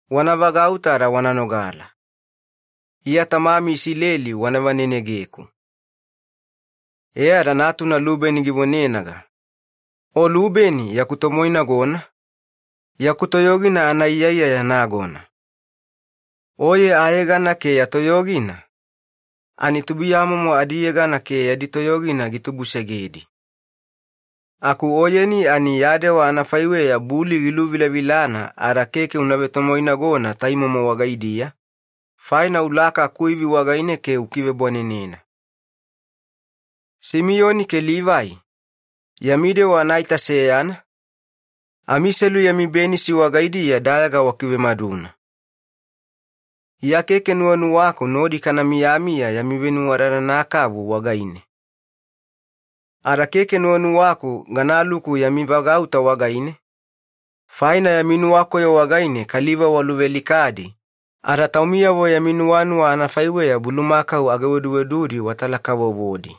“Wana vagauta ada wana nogala. Iya tamami Isileli wana vanenegeku.” E ada natuna Lubeni givonenaga, “O Lubeni yaku tomoinagona, yaku toyogina anaiyaiyaya nagona. Oye ayegana ke ya toyogina ani tubuiyamomo adiyegana ke yadi toyogina gitubusegedi. Aku oyeni ya dewa anafaiweya buli giluvilavilana ada keke una vetowainagona taimomo wagaidiya, faina ulaka akuivi wagaine ke ukivebwanenena. “Simiyoni ke Livai, yami dewa anaita seyana, amiselu yami benisi wagaidiya dayaga wakivemaduna. Iya keke gadaavi yami venuwadadana kavu wagaine ada keke gadaluku yami vagauta wagaine, faina yami nuwakoyo wagaine kaliva waluvealikadi, ada bulumakau ageweduwedudi watala-kavovodi yami nuwanuwa anafaiweya.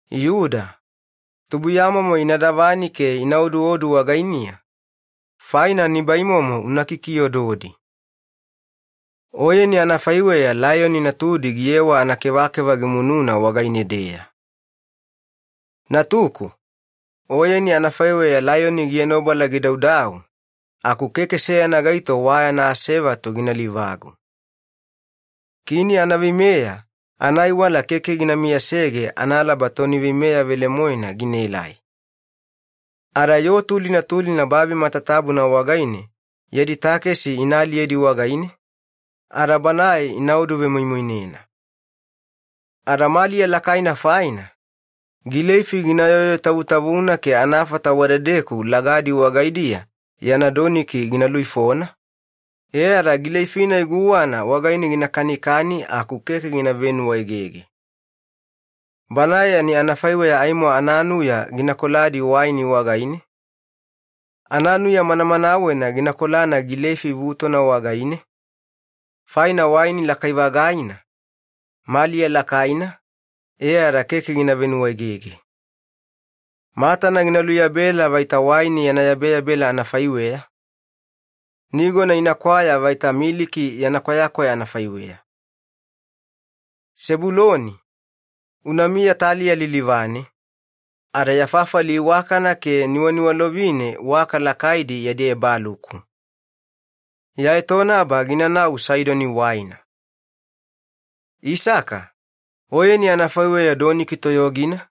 “Yuda, tubuiyamomo ina davani ke ina oduodu wagainiya faina nibaimomo una kikiododi. Oyeni anafaiweya laiyoni natudi giyewa anakevakeva gimunuga wagaine-deya. Natuku, oyeni anafaiweya laiyoni gienobala gidaudau, aku keke seyana gaito wayana asevatu gina livagu. Kini anaveimeya anaaiwala keke gina miyasege analaba toni veimeya velemoena ginaelai. Ada yoo tulina tulina babi matatabuna wagaine yadi takesi ina aliyedi wagaine ada banae ina oduvemoimoinena. E ada maliya lakaina faina gileifi gina yoyotavutavuna ke anafata wadedeku lagadi wagaidiya yana doniki gina luifona e ada gileifi-nai guwana wagaine gina kanikani aku keke gina venuwaegege. Banae ani anafaiweya aimo ananuya gina koladi waini wagaine, ananuya manamanawena gina kolana gileifi vutona wagaine, faina waini lakai-vagaina, maliya lakaina e ada keke gina venuwaegege. Matana gina luyabela anafaiweya waini yana yabeyabela, nigona inakwaya anafaiweya miliki yana kwayakwaya. “Sebuloni, unamiya taliya lilivane, ada ya fafali iwakana ke niwaniwalovine waka lakaidi yadi ebaluku. Ya etonaba ginanau Saidoni waina. “Isaka, oyeni anafaiweya doniki toyogina,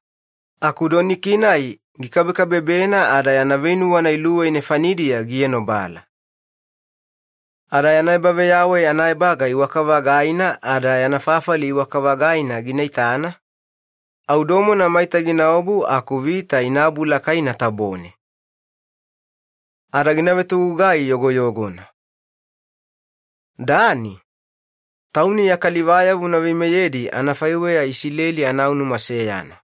aku doniki-nai gikabekabebena ada yana veinuwana luwei nefanidiya gienobala. Ada yana ebaveyawai anaebaga iwaka-vagaina ada yana fafali iwaka-vagaina gina itana, au domona maita ginaobu aku vita ina abulakaina tabone. Ada gina vetogugai yogoyogona. “Dani, tauni ya kalivayavo una veimeyedi anafaiweya Isileli anaunuma seyana.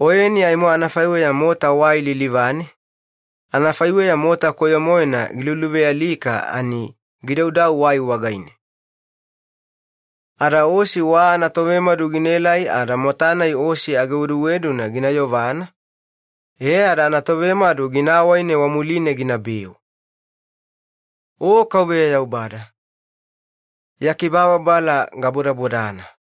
Oyeni aimo anafaiweya mota wai lilivane, anafaiweya mota manimaninina gidaudau wai wagaine. Ada osi wa anatovemadu ginaelai ada mota-nai osi ageweduweduna gina yovana, e ada anatovemadu gina awaine wamuline ginabeu. “O Yaubada, ya kibababala gabodana.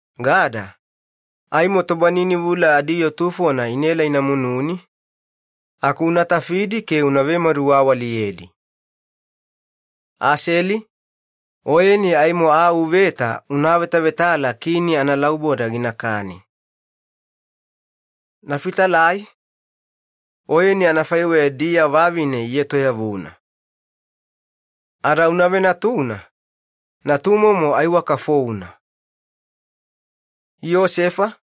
“Gada, aimo tobaninivula adiyoo tufona inaela inamununi, aku unatafidi ke una vemaduwawaliyedi. “Aseli, oyeni aimo aa uveta una avetavetala kini analauboda ginakani. “Nefitalai, oyeni anafaiweya diya vavine ietoyavuna. Ada una venatuna, natumomo aiwaka founa. “Yosefa,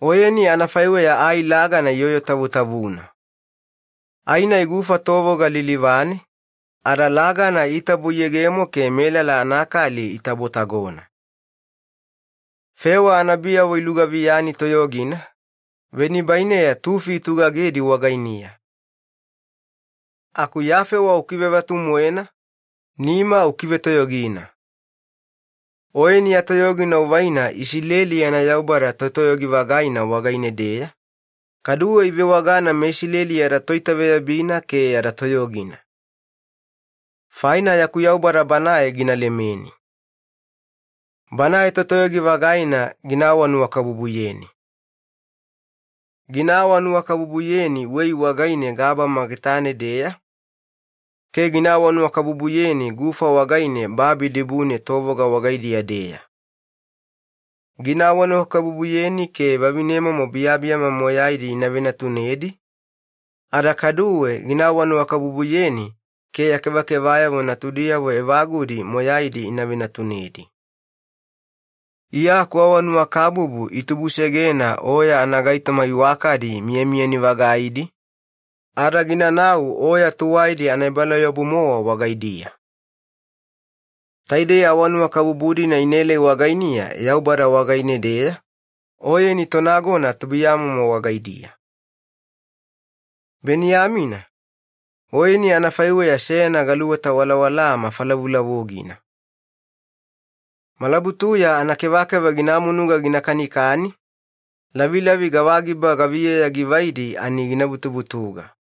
oyeni anafaiweya ai lagana iyoyo tavutavuna. Ai-nai gufa tovoga lilivane, ada lagana itabo iyegemo ke melala anakali itabo-tagona. Fewa anabiyavo ilugaviyani toyogina, venibaineya tufi itugagedi wagainiya. Aku ya fewa ukivevatu-moena, nima ukivetoyogina. Oyeni ya toyogina uvaina Iyakobo yana Yaubada Totoyogi-vagaina wagaine-deya, kaduwe ivewagana meIsileli yada Toitaveyabina ke yada Toyogina. Faina yaku Yaubada Banae gilemelemeni. Banae Totoyogi-vagaina giawaawanuwakabubuyeni. Giawaawanuwakabubuyeni wei wagaine gabama getane-deya, ke giawaawanuwakabubuyeni gufa wagaine babi dibune tovoga wagaidiya-deya. Giawaawanuwakabubuyeni ke vavinemomo biyabiyama moyaidi ivenatunedi, ada kaduwe giawaawanuwakabubuyeni ke ya kevakevayavo natudiyavo evagudi moyaidi ivenatunedi. Iya akuawanuwakabubu itubusegena oya anagaitoma iwakadi miyamiyani-vagaidi, ada ginanau oya tuwaidi anaebalauyabu-mowa wagaidiya. Taidei awanuwakabubu-dina inaelai wagainiya Yaubada wagaine-deya, oyeni tonagona atubulugamomo wagaidiya. “Beniyamina, oyeni anafaiweya seyana galuweta walawalaa mafalavulavugina. Malabutuya anakevakeva gina munuga gina kanikani, lavilavi gavana givaina gina vutuvutuga.”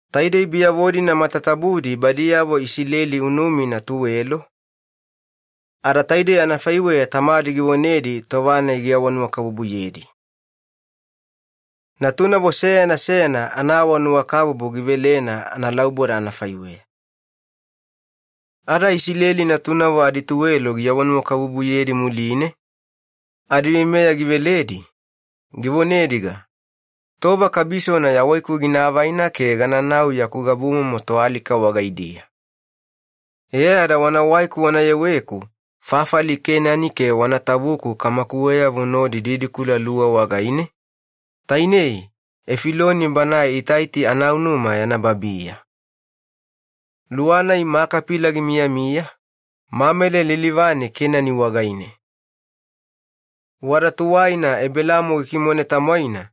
Taidei biyavo-dina matatabudi badiyavo Isileli unumina tuwelo, ada taidei anafaiweya tamadi givonedi tova-nai giawanuwakabubuyedi. Natunavo seyana seyana anaawanuwakabubu givelena analauboda wagaine. Iyakobo yana alika. Ada Iyakobo natunavo adituwelo giawanuwakabubuyedi muline, adiveimeya giveledi, givonediga, “Tova kabisona yawaiku ginaavaina ke gananau yaku gabumomo toalika wagaidiya. E ada wanawaiku wanayeweku fafali Kenani ke wana tavuku kamakuweyavo nodi kabala luwa wagaine tainei Efiloni banae Itaiti anaunuma yana babiya. Luwa-nai Makapila gimiyamiya, Mamele lilivane Kenani wagaine. Wada tuwaina Ebelaamo gikimone tamwaina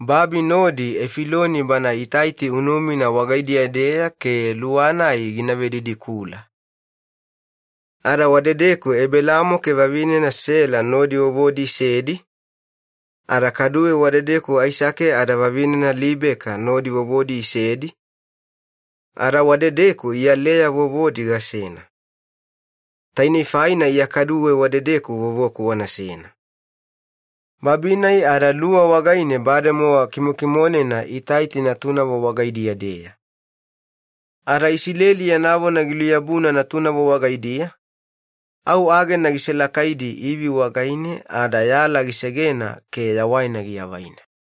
babi nodi Efiloni bana Itaiti unumina wagaidiya-deya ke luwa-nai gina vedidikula. Ada wadedeku Ebelaamo ke vavinena Sela nodi itavudi, ada kaduwe wadedeku Aisake ada vavinena Libeka itavudi, ada wadedeku iya Leya gatavudi. Tainei faina iya kaduwe wadedeku wana tavuku. Babi-nai ada luwa wagaine bademowa kimokimonena Itaiti natunavo wagaidiya-deya.” Ada Iyakobo yana vona giluyabuna natunavo wagaidiya, au agena giselakaidi ivi wagaine ada yala gisegena ke yawaina giavaina.